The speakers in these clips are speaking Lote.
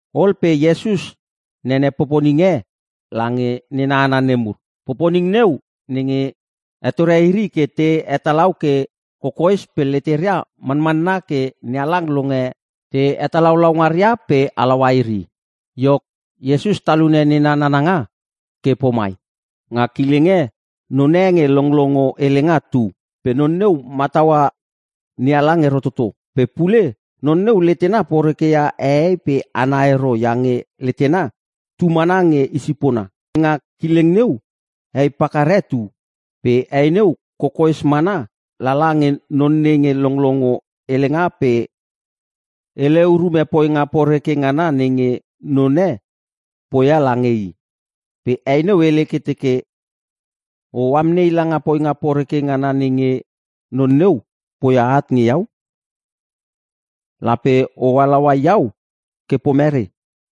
Ol pe Iesus nene poponing e lange nena hana nemur. Poponing neu, nenge hetore iri ke te hetalau ke kokoes pe leteria manmanna ke NeHalang longe te hetalaulau ngaria pe halaua iri. Iok, Iesus talune nena nananga ke pomai, “Nga kileng e none nge longlongo helenga tu. Pe non neu mataua NeHalang ero toto. Pe pule non neu letena porekeia hehei pe hana ero iange letena tu mana nge i sipona. Pe nga kileng neu hei pakar e tu. Pe hei neu kokoes mana lala nge non nenge longlongo helenga pe hele urume poinga poreke ngana nenge none poia lange i. Pe hei neu hele ke teke, ‘O amnei langa poinga poreke ngana nenge non neu poia at nge iau. Lape o halaua iau ke pomere?’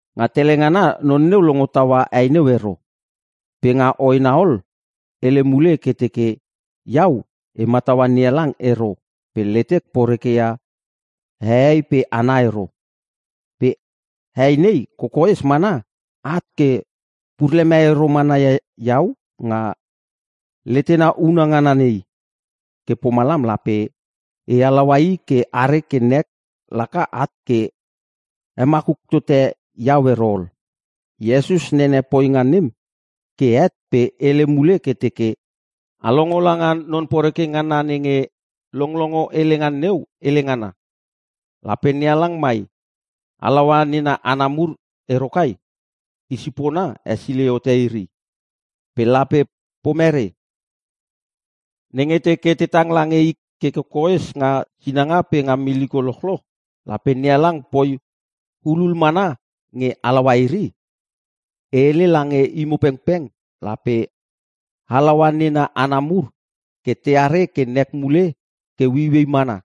“Nga tele ngana non neu longo taua hei neu ero. Pe nga hoena ol hele mule ke teke, ‘Iau e mataua NeHalang ero pe letek porekeia hehei pe hana ero. Pe hei nei kokoes mana at ke pur leme ero mana ia iau nga letena una ngana nei. Ke pomalam lape e halaua i ke are ke nek laka at ke hemakuk tote iau ero ol.’” Iesus nene poponing nem ke het pe hele mule ke teke, “A longo langa non poreke ngana nenge longolongo helenga neu hele ngana. Lape NeHalang mai halaua nena hana mur ero kai? I sipona hesilei hote iri. Pe lape pomere? Nenge teke te tang lange i ke kokoes nga sinanga pe nga miliko lochloch lape NeHalang poi hulul mana nge halaua iri? E hele lange imo pengpeng lape halaua nena hana mur ke teare ke nek mule ke ueiuei mana.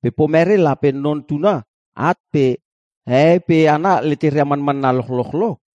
Pe pomere lape Non Tuna at pe hehei pe hana leteria manmanna lochloch lo?”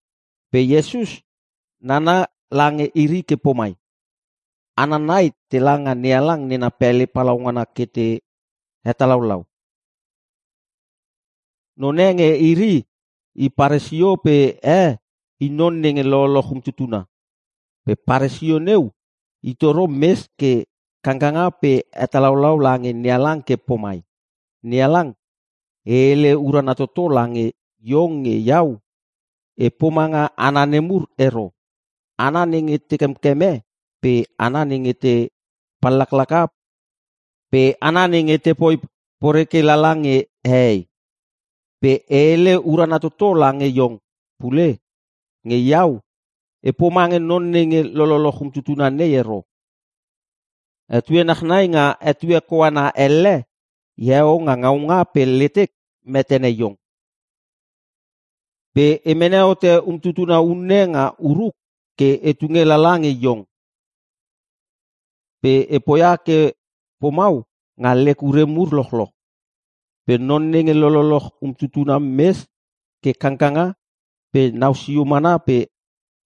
Pe Iesus nana lange iri ke pomai, “Hana nai tela nga NeHalang nena pele palaungana ke te hetalaulau. Non e nge iri i Paresio pe e i non nenge lololoch umtutuna. Pe Paresio neu i toro mes ke kangkanga pe hetalaulau lange NeHalang ke pomai, ‘NeHalang, e hele urana toto lange iong nge iau e pomanga hana nemur ero. Hana nenge te kemkeme pe hana nenge te pallaklaka pe hana nenge tepoi poreke lala nge hehei. Pe e hele urana toto lange iong pule nge iau e pomange non nenge lololoch umtutuna nei ero. Etue nachnai nga etue koana elle eheo nga ngaunga pe letek metene iong. Pe e mene hote umtutuna unne nga uruk ke e tunge lala nge iong. Pe e poia ke pomau nga lek ure mur lochloch.’ “Pe non nenge lololoch umtutuna mes ke kangkanga pe nau sio mana pe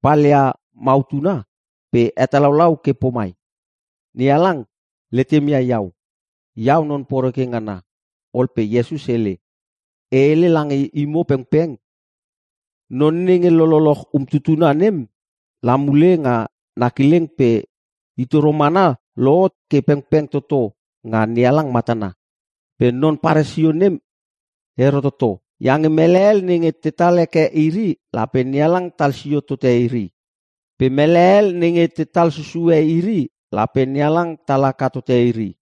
palia mautuna pe hetalaulau ke pomai, ‘NeHalang, letem ia iau. Iau non poreke ngana.’” Ol pe Iesus hele, “E hele lange imo pengpeng, non nenge lololoch umtutuna nem la mule nga na kileng pe i toro mana lohot ke pengpeng toto nga NeHalang matana. Pe non Paresio nem ero toto. Iange mele hel nenge tetal heke iri lape NeHalang tal sio tote iri. Pe mele hel nenge tetal susue iri lape NeHalang tal haka tote iri.”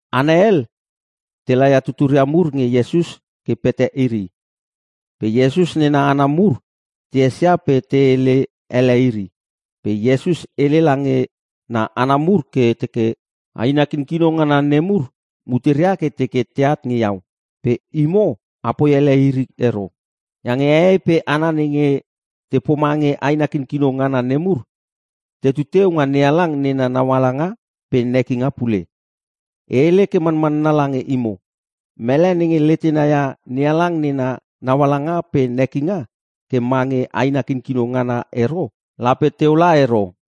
Hana hel te laia tuturia mur nge Iesus ke pete iri. Pe Iesus nena hana mur te esia pe te hele ele iri. Pe Iesus hele lange na hana mur ke teke, “Aina kinkino ngana nem mur muteria ke te teke teat nge iau. Pe imo apoi ele iri ero. Iange hehei pe hana nenge te pomange aina kinkino ngana nemur, tetu teu nga NeHalang nena naualanga pe nekinga pule. E hele ke manmanna lange imo, mele nenge letena ia NeHalang nena naualanga pe nekinga ke mange aina kinkino ngana ero lape teu la ero.”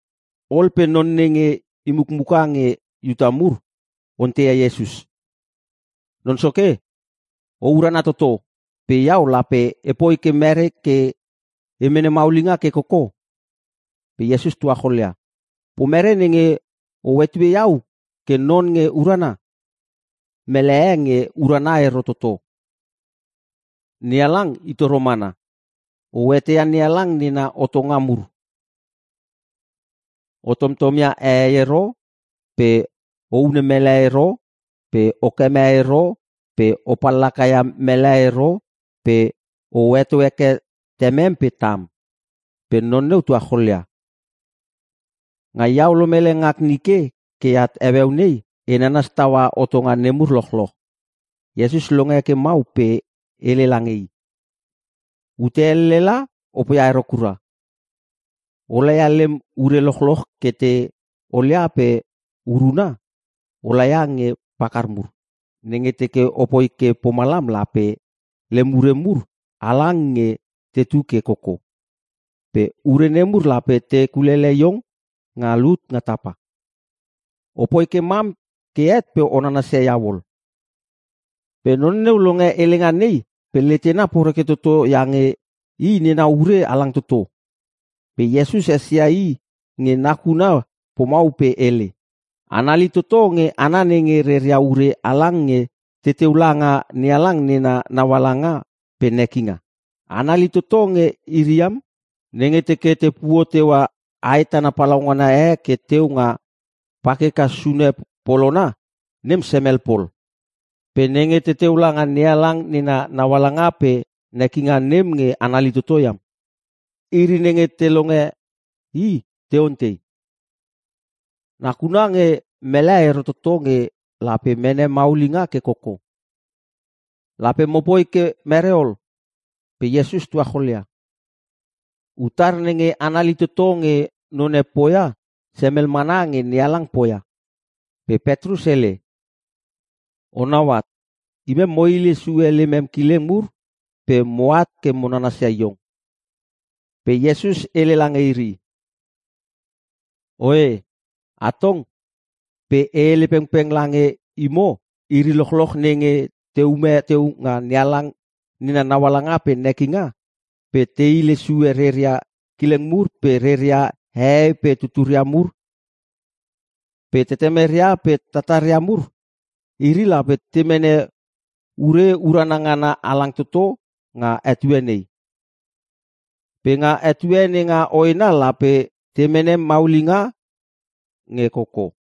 Ol pe non nenge i mukmuka nge Iuta mur onteia Iesus, “Non soke, o urana toto. Pe iau lape epoi ke mere ke e mene maulinga ke koko?” Pe Iesus tuacholia, “Pomere nenge o hetue iau ke non nge urana? Mele e nge urana ero toto. NeHalang i toro mana. O eteia NeHalang nena hotonga mur. O tomtom ia hehei ero pe o hune mele ero pe okeme ero pe o pallaka ia mele ero pe o heto heke temem pe tam.” Pe non neu tuacholia, “Nga iau lomele ngak nike ke at heueu nei e nanas taua hotonga nemur lochloch.” Iesus longe ke mau pe hele lange i, “Ute elle la o poia ero kura. O laia lem ure lochloch ke te olia pe uruna, o laia nge pakar mur. Nenge teke opoi ke pomalam lape lem ure mur halang nge tetu ke koko. Pe ure nemur lape te kulele iong nga lut nga tapa. Opoi ke mam ke het pe o nanasia iau ol.” Pe non neu longe helenga nei pe letena poreke toto iange i nena ure halang toto. Pe Iesus esia i nge nakuna pomau pe hele, “Anali toto nge hana nenge reria ure halang nge teteu langa NeHalang nena naualanga pe nekinga. Anali toto nge iri iam. Nenge teke te puo teua ae tana palaungana e ke teu nga pakeka sune polona, nem semel pol. Pe nenge teteu langa NeHalang nena naualanga pe nekinga nem nge anali toto iam.” Iri nenge te longe i te ontei, “Nakuna nge mele ero toto nge lape mene maulinga ke koko. Lape mopoi ke mere ol?” Pe Iesus tuacholia, “Utar nenge anali toto nge none poia semel mana nge NeHalang poia.” Pe Petrus hele, “Onau at, imem mo hile sue lemem kileng mur pe moat ke mo nanasia iong.” Pe Iesus hele lange iri, “Oe, atong pe e hele pengpeng lange imo iri lochloch nenge te ume teu nga NeHalang nena naualanga pe nekinga pe te hile sue reria kileng mur pe reria hehei pe tuturia mur pe tetemeria pe tataria mur, iri lape te mene ure urana ngana halang toto nga etue nei. Pe nga etue nenga hoena lape te mene maulinga nge koko.”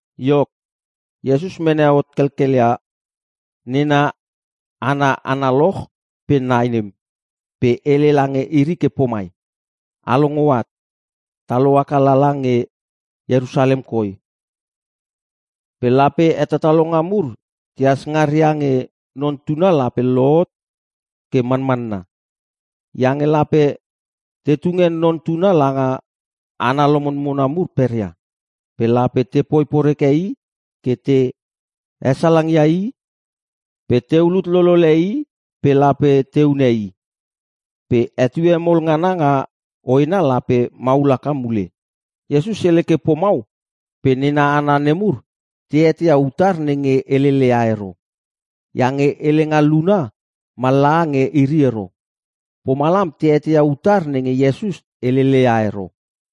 Iok, Iesus mene hot kelkelia nena hana analoch pe nai nem pe hele lange iri ke pomai, “A longo at. Ta lohaka lala nge Ierusalem koi pe lape hetatalonga mur tehas ngaria nge Non Tuna lape lohot ke manmanna. Iange lape te tunge Non Tuna langa hana lomonmona mur peria. Pe lape tepoi poreke i ke te hesalang ia i pe te ulut lolele i pe lape te hune i. Pe etue mol ngana nga hoena lape maul haka mule.” Iesus hele ke pomau pe nena hana nemur te eteia utar nenge helele ia ero. Iange helenga luna mallaha nge iri ero. Pomalam te eteia utar nenge Iesus helele ia ero.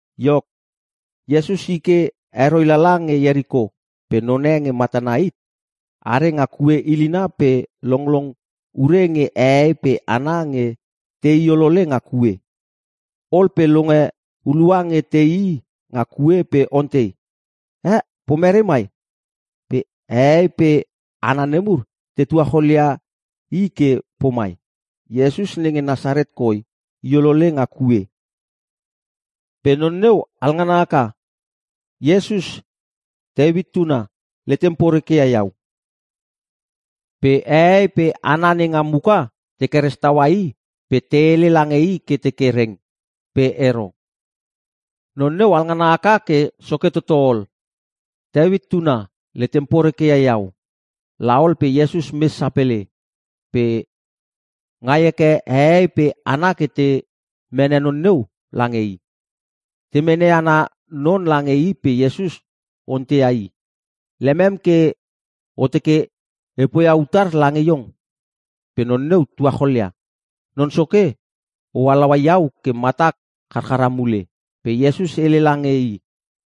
Iok, Iesus i ke heroi lala nge Ieriko pe none nge matana hit are nga kue ilina pe longlong ure nge hehei pe hana nge tei olole nga kue. Ol pe longe hulua nge teii nga kue pe ontei, “Eh! Pomere mai?” Pe hehei pe hana nemur te tuacholia i ke pomai, “Iesus nenge Nasaret koi i olole nga kue.” Pe non neu halngana haka, “Iesus! Teuit tuna! Letem poreke ia iau!” Pe hehei pe hana nenga muka te keres taua i pe te hele lange i ke teke reng. Pe ero. Non neu alngana haka ke soke toto ol, “Teuit tuna! Letem poreke ia iau!” La ol pe Iesus mes sapele. Pe ngai heke hehei pe hana ke te mene non neu lange i. Te mene ana non lange i pe Iesus onteia i, “Lemem ke o teke e poia utar lange iong?” Pe non neu tuacholia, “Non Soke, o halaua iau ke matak charchara mule.” Pe Iesus hele lange i,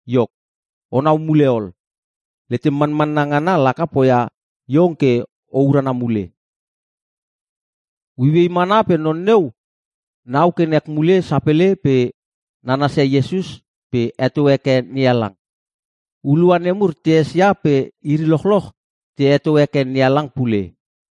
“Iok, onau mule ol. Letem manmanna ngana laka poia iong ke o urana mule.” Ueiuei mana pe non neu nau ke nek mule sapele pe nanasia Iesus pe heto heke NeHalang. Hulua nemur te esia pe iri lochloch te heto heke NeHalang pule.